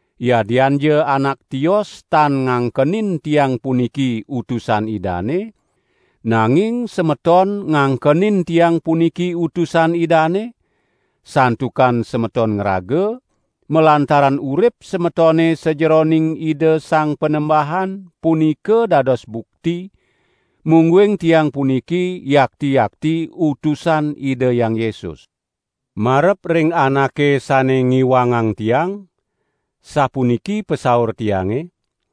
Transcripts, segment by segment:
Yadianja anak tios tan ngangkenin tiang puniki utusan Idane, nanging semeton ngangkenin tiang puniki utusan Idane, santukan semeton ngraga, malantaran urip semetone sajeroning Ida Sang Panembahan punika dados bukti, mungguing tiang puniki yakti-yakti utusan Ida Hyang Yesus. Marep ring anake sane ngiwangang tiang, sapuniki pasaur tiange: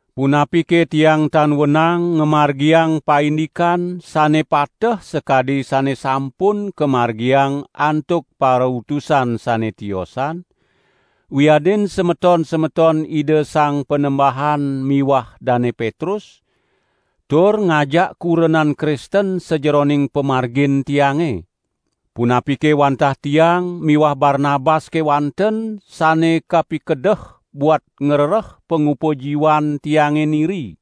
Punapike tiang tan wenang ngamargiang paindikan sane pateh sakadi sane sampun kamargiang antuk parautusan sane tiosan wiadin semeton-semeton Ida Sang Panembahan miwah Dane Petrus, tur ngajak kurenan Kristen sajeroning pamargin tiange? Punapike wantah tiang miwah Barnabas kewanten sane kapikedeh buat ngrereh pangupa jiwan tiange niri?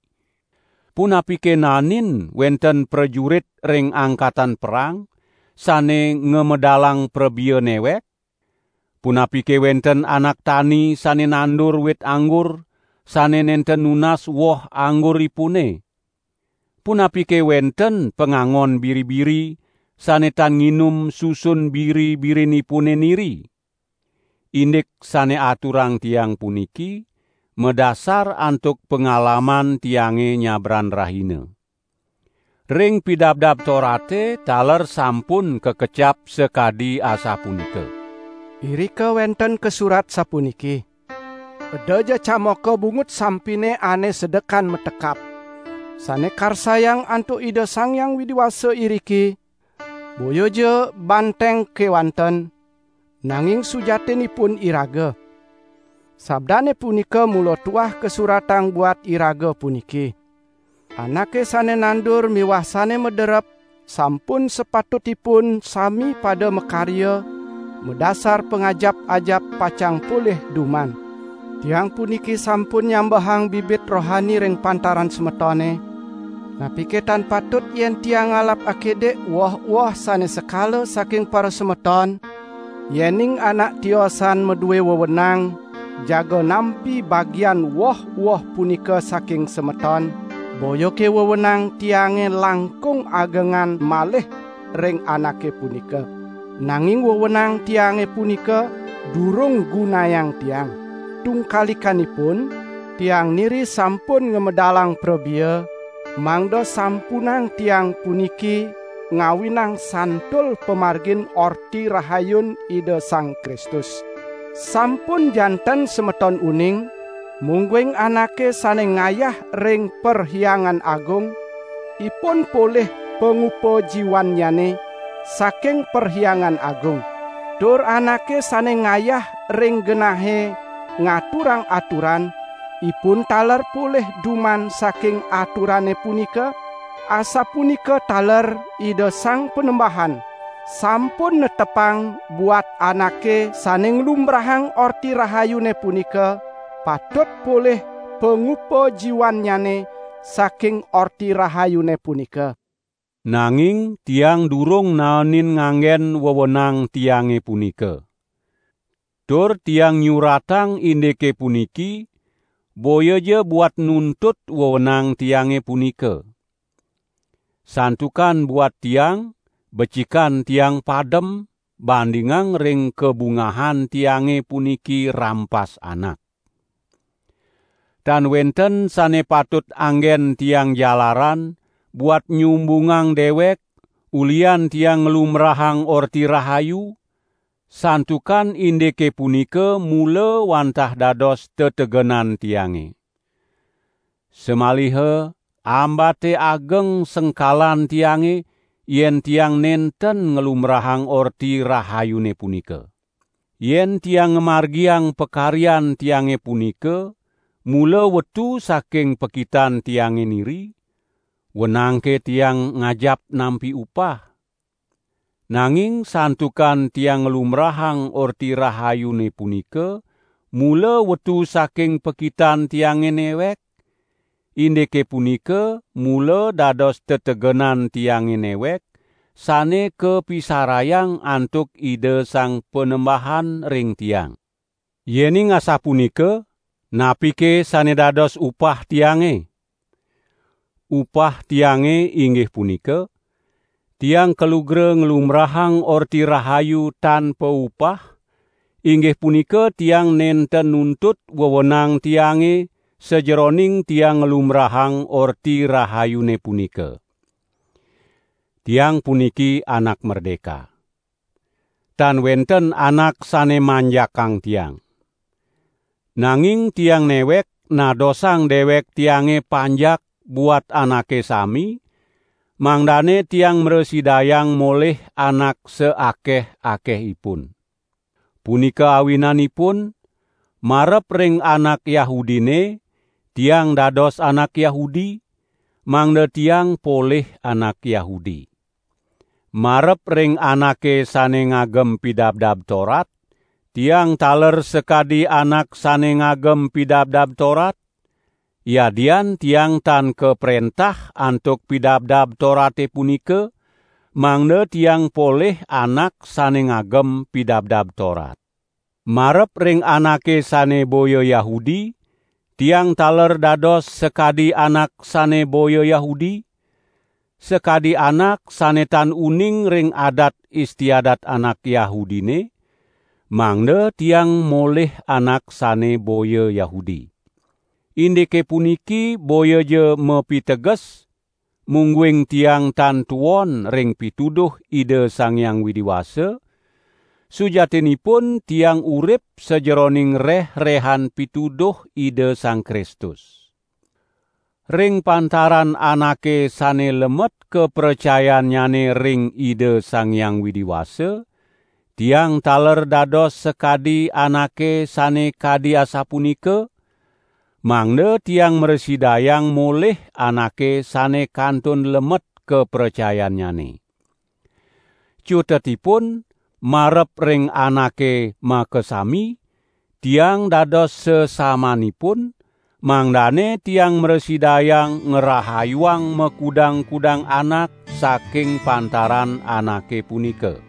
Punapike naenin wenten prajurit ring angkatan perang, sane ngamedalang prabea newek? Punapike wenten anak tani sane nandur wit anggur, sane nenten nunas woh angguripune? Punapike wenten pangangon biri-biri sane tan nginum susun biri-birinipune niri? Indik sane aturang tiang puniki madasar antuk pangalaman tiange nyabran rahina. Ring Pidabdab Torate taler sampun kakecap sakadi asapunika. Irika wenten kasurat sapuniki: "Edaja camoka bungut sampine ane sedekan matekap!" Sane karsayang antuk Ida Sang Hyang Widi Wasa iriki, boyaja banteng kewanten, nanging sujatinipun iraga. Sabdane punika mula tuah kasuratang buat iraga puniki. Anake sane nandur miwah sane maderep sampun sapatutipun sami pada makarya madasar pangajap-ajap pacang polih duman. Tiang puniki sampun nyambehang bibit rohani ring pantaran semetone, napike tan patut yen tiang ngalap akidik woh-woh sane sekala saking parasemeton? Yening anak tiosan madue wewenang jaga nampi bagian woh-woh punika saking semeton, boyake wewenang tiange langkung agengan malih ring anake punika. Nanging wewenang tiange punika durung gunayang tiang. Tungkalikanipun tiang niri sampun ngamedalang prabea, mangda sampunang tiang puniki ngawinang santul pamargin Orti Rahayun Ida Sang Kristus. Sampun janten semeton uning mungguing anake sane ngayah ring Perhyangan Agung, ipun polih pangupa jiwannyane saking Perhyangan Agung. Tur anake sane ngayah ring genahe ngaturang aturan, ipun taler polih duman saking aturane punika? Asapunika taler Ida Sang Panembahan sampun netepang buat anake sane nglumbrahang Orti Rahayune punika, patut polih pangupa jiwannyane saking Orti Rahayune punika. Nanging tiang durung naenin nganggen wewenang tiange punika. Tur tiang nyuratang indike puniki boyaja buat nuntut wewenang tiange punika. Santukan buat tiang becikan tiang padem, bandingang ring kabungahan tiange puniki rampas anak! Tan wenten sane patut anggen tiang jalaran buat nyumbungang dewek ulihan tiang nglumbrahang Orti Rahayu, santukan indike punika mula wantah dados tetegenan tiange. Samaliha ambate ageng sengkalan tiange yen tiang nenten nglumbrahang Orti Rahayune punika. Yen tiang ngamargiang pakaryan tiange punika mula wetu saking pakitan tiange niri, wenangke tiang ngajap nampi upah? Nanging santukan tiang nglumbrahang Orti Rahayune punika mula wetu saking pakitan tiange newek, indike punika mula dados tetegenan tiange newek sane kapisarayang antuk Ida Sang Panembahan ring tiang. Yening asapunika napike sane dados upah tiange? Upah tiange inggih punika: Tiang kalugra nglumbrahang Orti Rahayu tan paupah, inggih punika tiang nenten nuntut wewenang tiange sajeroning tiang nglumbrahang Orti Rahayune punika. Tiang puniki anak merdeka. Tan wenten anak sane manjakang tiang. Nanging tiang newek nadosang dewek tiange panjak buat anake sami, mangdane tiang mrasidayang molih anak saakeh-akehipun. Punika awinanipun, marep ring anak Yahudine tiang dados anak Yahudi, mangda tiang polih anak Yahudi. Marep ring anake sane ngagem Pidabdab Torat, tiang taler sakadi anak sane ngagem Pidabdab Torat, yadian tiang tan kaprentah antuk Pidabdab Torate punika mangda tiang polih anak sane ngagem Pidabdab Torat. Marep ring anake sane boya Yahudi tiang taler dados sakadi anak sane boya Yahudi, sakadi anak sane tan uning ring adat istiadat anak Yahudine, mangda tiang molih anak sane boya Yahudi. Indike puniki boyaja mapiteges mungguing tiang tan tuon ring pituduh Ida Sang Hyang Widi Wasa; sujatinipun tiang urip sajeroning reh-rehan pituduh Ida Sang Kristus. Ring pantaran anake sane lemet kapracayannyane ring Ida Sang Hyang Widi Wasa, tiang taler dados sakadi anake sane kadi asapunika, mangda tiang mrasidayang molih anake sane kantun lemet kapracayannyane. Cutetipun marep ring anake makasami tiang dados sasamanipun, mangdane tiang mrasidayang ngrahayuang makudang-kudang anak saking pantaran anake punika.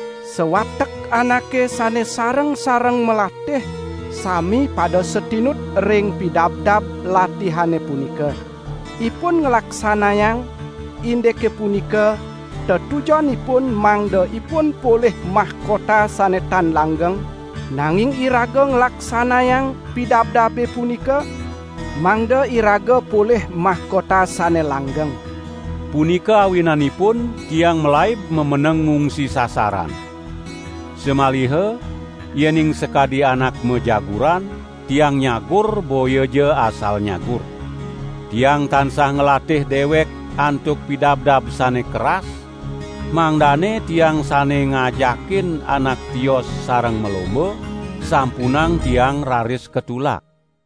Sawatek anake sane sareng-sareng malatih sami pada satinut ring pidabdab latihane punika. Ipun nglaksanayang indike punika tetujonipun mangda ipun polih mahkota sane tan langgeng, nanging iraga nglaksanayang pidabdabe punika mangda iraga polih mahkota sane langgeng. Punika awinanipun tiang malaib mameneng ngungsi sasaran. Samaliha yening sakadi anak majaguran, tiang nyagur boyaja asal nyagur. Tiang tansah nglatih dewek antuk pidabdab sane keras, mangdane tiang sane ngajakin anak tios sareng malomba, sampunang tiang raris katulak.